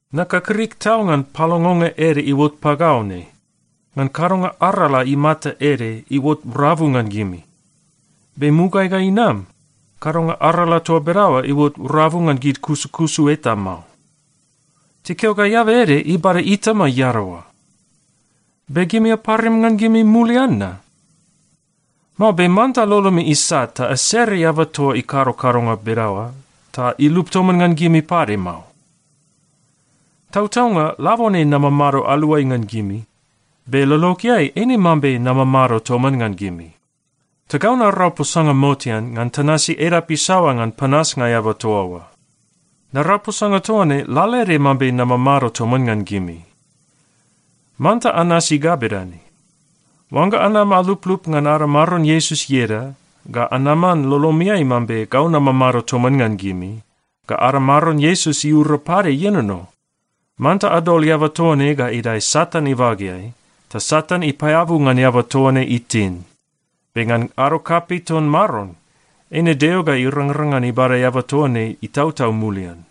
Nakakrik tau ngan palongonga ede iuot pagau ne, ngan kadonga arala imata ede iuot rabu ngan gimi. Be mugaeai ga inam, kadonga arala toa bedaoa iuot rabu ngan gid kusukusu eta mao. Tikeo ga eaba ede ibada itama iadaoa. Be gimi aparim ngan gimi mulian na? Mao be manta lolomi isat ta asere eaba toa ikado kadonga bedaoa ta ilup toman ngan gimi pade mao. Tautaunga, labone namamado aluai ngan gimi, be lologeai, eine mambe namamado toman ngan gimi. Ta gau narau posanga motean ngan tanasi edap isaoa ngan panasnga eaba toa oa. Narau posanga toa ne lalaede mambe namamado toman ngan gimi. Manta anasi ga bedane: Oangga anam aluplup ngan ada Maron Iesus ieda, ga anaman lolomiai mambe gau namamado toman ngan gimi, ga ada Maron Iesus iura pade ienono, manta adol eaba toa ne ga idae Satan ibageai, ta Satan ipaeabu ngan eaba toa ne itin. Be ngan ado kapei ton Maron, eine Deo ga irangrang ngan ibada eaba toa ne itautau mulian.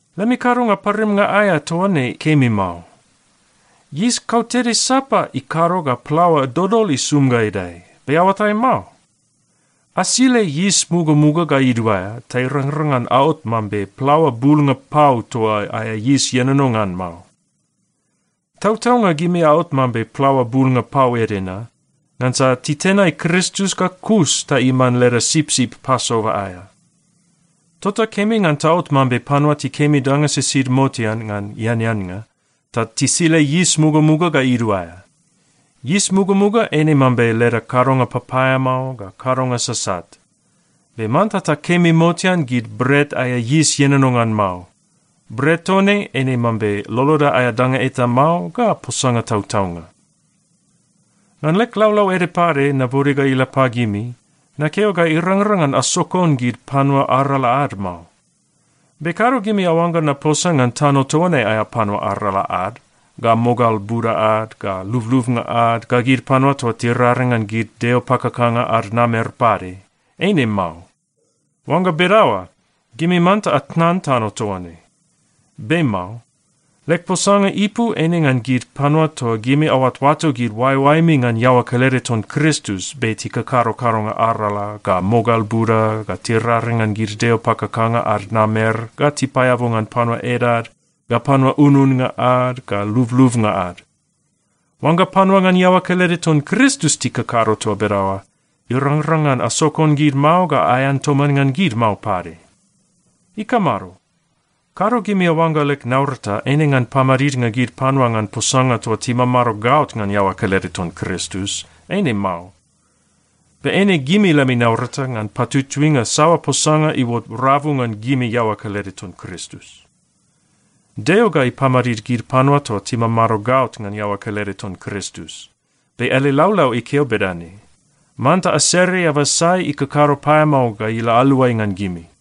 Lemi kadonga parimnga aea toa ne kemi mao. Yis kautede sapa ikado ga plaoa dodol isum ga idae, be aoatai mao? Asile yis mugamuga ga iduaea ta irangrang ngan aot mambe plaoa bulnga pau toa aea yis ienono ngan mao. Tautaunga gimi aot mambe plaoa bulnga pau ede na, ngansa titenai Kristus ga kus ta iman leda sipsip Pasova aea. Tota kemi ngan taot mambe panua tikemi danga sisid motean ngan eaneannga, ta tisile yis mugamuga ga iduaea. Yis mugamuga eine mambe leda kadonga papaeamao ga kadonga sasat. Be manta takemi motean gid bret aea yis ienono ngan mao. Bret toa ne eine mambe loloda aea danga eta mao ga posanga tautaunga. Ngan leg laulau ede pade nabode ga ila pagimi, nakeo ga irangrang ngan asokon gid panua arala ad mao. Be kado gimi aoangga naposa ngan tano toa ne aea panua arala ad, ga mogal buda ad, ga lublubnga ad, ga gid panua toa tiraring ngan gid deo pakakanga ad namer pade. Eine mao. Oangga bedaoa, gimi manta atnan tano toa ne. Be mao. Leg posanga ipu eine ngan gid panua toa gimi aoatoato gid oaeoaemi ngan iaoa kelede ton Kristus, be tikakado kadonga arala, ga mogal buda, ga tiraring ngan gid deo pakakanga ad namer, ga tipaeabu ngan panua edad, ga panua ununnga ad, ga lublubnga ad. Oangga panua ngan iaoa kelede ton Kristus tikakado toa bedaoa, irangrang ngan asokon gid mao ga aean toman ngan gid mao pade. Ikamado? Kado gimi aoangga leg naurata eine ngan pamadidnga gid panua ngan posanga toa timamado gaot ngan iaoa kelede ton Kristus. Eine mao. Be eine gimi lemi naurata ngan patutuinga saoa posanga iuot rabu ngan gimi iaoa kelede ton Kristus. Deo ga ipamadid gid panua toa timamado gaot ngan iaoa kelede ton Kristus. Be ele laulau ikeo bedane, “Manta asere eaba sai ikakado paeamao ga ila aluai ngan gimi!”